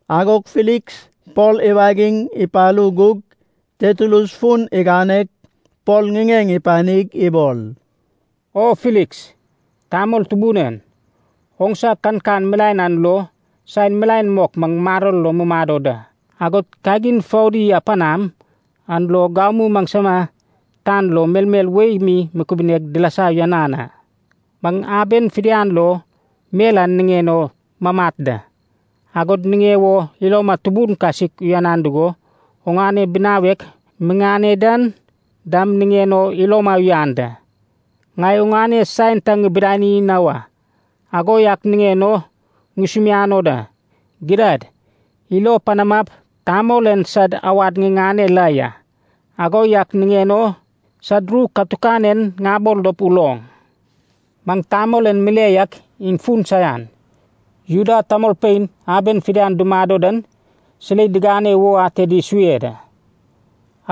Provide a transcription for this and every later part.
Agog Filiks Pol iwagig ipalu gug, Tertulus fun iganeg Pol ŋiŋeŋ ipanig ibol, “O Filiks, tamol tubun en! Oŋsa kankan milaen an lo saen milaen mok maŋ maror lo mi mumado da. Agod kagin foudi a panaŋ an lo gamu maŋsama tan lo melmel wei mi kubuneg dilasa uyanan a. Maŋ aben fidian lo mel an niŋen o mamat da. Agod niŋe wo iloma tubun kasik uyan dugo oŋane binawek miŋane dan dam niŋen o iloma uyanan da. Ŋai oŋane saen ta ŋibidani na wa. Ago yak niŋen o ŋusumiano da, gidad, ilo panamap tamol en sad awad ŋiŋane la ya, ago yak niŋen o sad ru katukan en ŋabol dop uloŋ. Maŋ tamol en mile yak iŋ fun saian. Juda tamolpein aben fidian dumado dan silei digane wo ated isue da.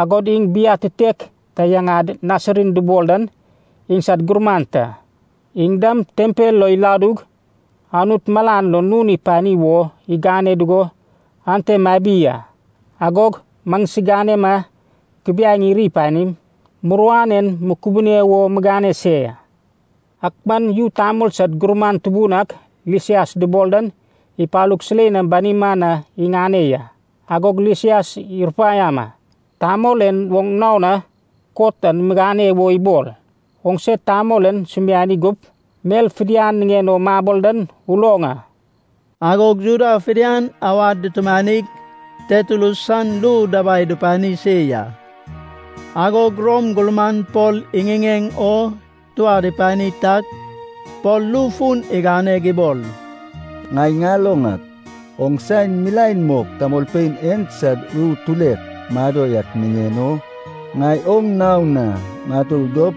Agod iŋ biatitek ta yaŋad Nasarin dubol dan iŋsad gurman ta. Iŋ dam tempel lo iladug Anut malan lo nun ipani wo igane dugo ante mabi a. Agog maŋsiganema kubiaeŋ iri panim muruan en mukubune wo migane se ya. Ak man yu tamol sad gurman tubun ak Lisias dubol dan ipalug silei nam banima na iŋane ya. Agog Lisias irupaiama, tamol en oŋ nao na kot an migane wo ibol. Oŋse tamol en sumiani gup, mel fidian niŋen o mabol dan uloŋ a.” Agog Juda fidian awad dutumanig, Tertulus san ru dabai dupani se ya. Agog Rom gurman Pol iŋiŋeŋ o tuad ipani tag Pol ru fun iganeg ibol, “Ŋai ŋaloŋ ak, oŋ saen milaen mok tamolpein en sad ru tulek mado yak niŋen o ŋai oŋ nao na ŋatur dop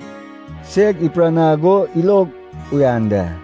seg ipiranag o ilog uyan da.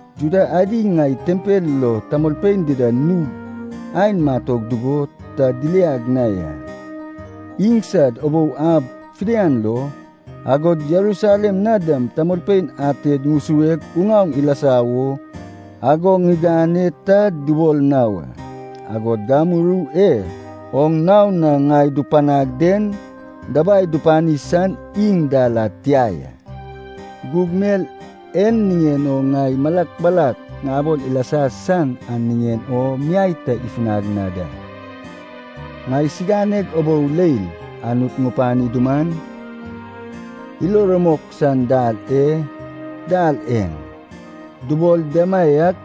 Juda adi ŋai tempel lo tamolpein dida nug aen matog dugo ta diliag na ya. Iŋsad ubou ab fidian lo, agod Jerusalem na dam tamolpein ated ŋusueg uŋaoŋ ilasa wo ago ŋigane ta dubol na wa. Agod gamu ru e oŋ nao na ŋai dupanag den dabai dupani san iŋ dal ad tia ya. Gug mel en niŋen o ŋai malak malak ŋabol ilasa san an niŋen o miai ta ifunag na da. Ŋaisiganeg ubou leil Anut ŋupani duman, ilo rumok san dal e ‘Dal En’ dubol demaiak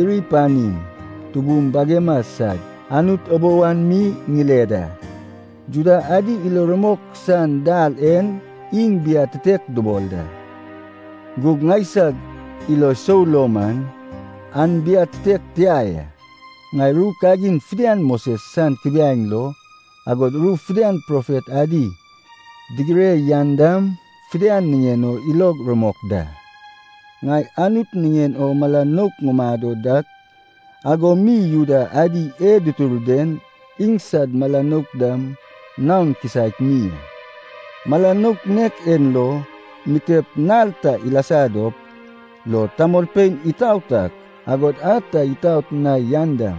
iri panim, tubum bagema sad Anut ubou an mi ŋile da. Juda adi ilo rumok san ‘Dal En’ iŋ biatitek dubol da. Gug ŋaisag ilo sou lo man an biatitek tia ya. Ŋai ru kagin fidian Moses san kubiaeŋ lo, agod ru fidian profet adi digire yan dam fidian niŋen o ilog rumok da. Ŋai Anut niŋen o mala nouk ŋumado dak ago mi Juda adi e dutur den iŋsad mala nouk dam naon kisaek mi a. Mala nouk nek en lo, mitep nal ta ilasa dop lo tamolpein itaot ak, agod a ta itaot na yan dam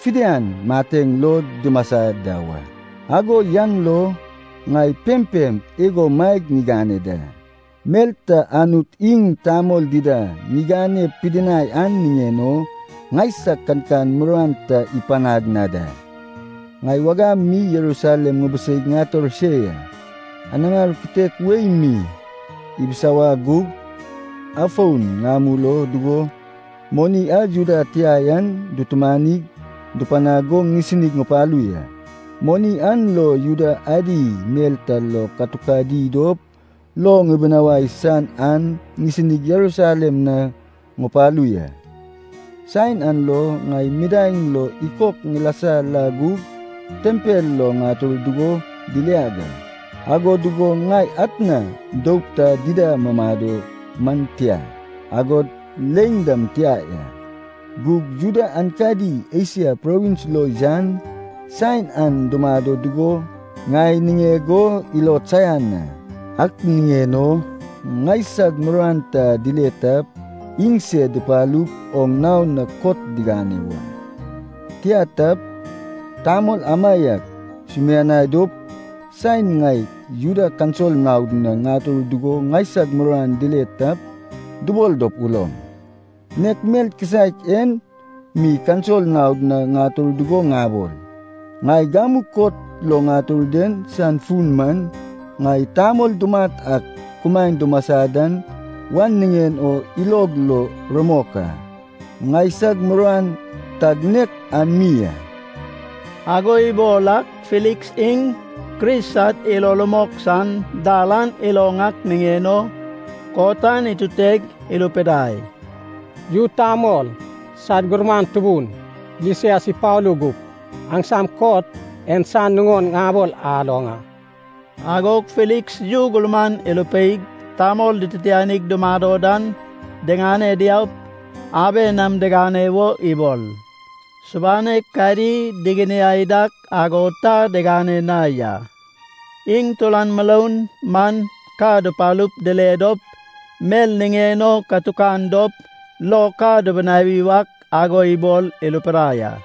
fidian mateŋ lo dumasa da wa. Ago yan lo ŋai pempem igo maeg ŋigane da, mel ta Anut iŋ tamol dida ŋigane pidinai an niŋen o ŋaisag kankan muruan ta ipanag na da. “Ŋai wagam mi Jerusalem ŋubiseig ŋator se ya. Anaŋar kitek wei mi ibisawag gug, afon ŋamul o dugo, moni a Juda tia yan dutumanig dupanag go ŋisinig ŋupalu ya. Moni an lo Juda adi mel ta lo katukadi dop lo ŋibinawai san an ŋisinig Jerusalem na ŋupalu ya. Saen an lo, ŋai midaeŋ lo ikok ŋilasa la gug tempel lo ŋator dugo diliag a. Ago dugo ŋai atna doup ta dida mumado man tia, agod leiŋ dam tia ya. Gug Juda aenkadi Esia provins lo yan saen an dumado dugo ŋai niŋeg o ilod saian a. Ak niŋen o ŋaisag muruan ta dile tap iŋsed dupalup oŋ nao na kot digane wa. Tia tap, tamol amaiak sumianai dop, saen ŋai Juda kaunsil naod na ŋatur dugo ŋaisag muruan dile tap, dubol dop uloŋ. Nek mel kisaek en mi kaunsil naod na ŋatur dugo ŋabol, ‘Ŋai gamu kot lo ŋatur den san fun man, ŋai tamol dumat ak kumaen dumasa da wan niŋen o ilog lo rumok a.’ Ŋaisag muruan tag nek an mi a.” Ago ibol ak, Filiks iŋ Kris sad ilo rumok san dal an iloŋ ak niŋen o kot an ituteg, irupidai, “Yu tamol sad gurman tubun Lisias ipalu gup, aŋsam kot en san nuŋon ŋabol aloŋ a.” Agog Filiks yu gurman irupeig tamol dititianig dumado dan diŋane diaup, aben nam digane wo ibol. Subanek kadi diginiai dak ago ta digane na ya. Iŋ turan muroun man ka dupalup dile dop mel niŋen o katukan dop lo ka dubinawi wak ago ibol irupidai a.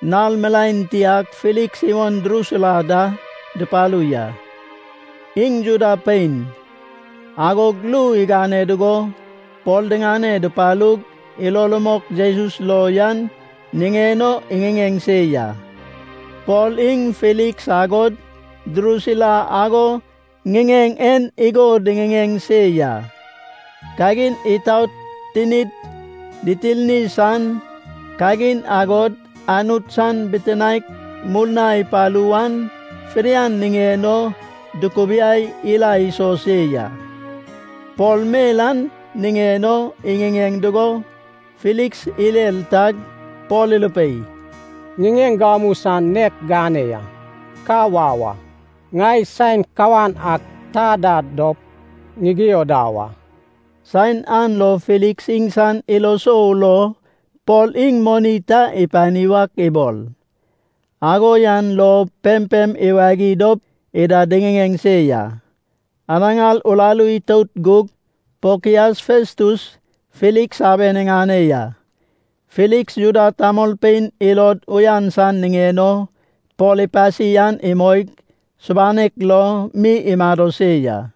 Nal milaen tiag Filiks iwon Drusila da dupalu ya. Iŋ Juda pein. Agog ru igane dugo Pol diŋane dupalug ilo rumok Jesus lo yan niŋen o iŋiŋeŋ se ya. Pol iŋ Filiks agod Drusila ago ŋiŋeŋ en igo diŋiŋeŋ se ya, kagin itaot, tinid ditirni san kagin, agod Anut san bitinaek murna ipalu wan, fidian niŋen o dukubiai ila iso se ya. Pol mel an niŋen o iŋiŋeŋ dugo, Filiks irer tag Pol irupei, “Ŋiŋeŋ gamu san nek gane ya. Ka wau a. Ŋai saen kawan ak ta da dop ŋigio da wa.” Saen an lo Filiks iŋsan ilo sou lo Pol iŋ moni ta ipani wak ibol. Ago yan lo pempem iwagi dop ida diŋiŋeŋ se ya. Anaŋar uraru itout gug Pokias Festus, Filiks aben iŋane ya. Filiks Juda tamolpein ilod uyan san niŋen o Pol ipasi an imoig, subanek lo mi imado se ya.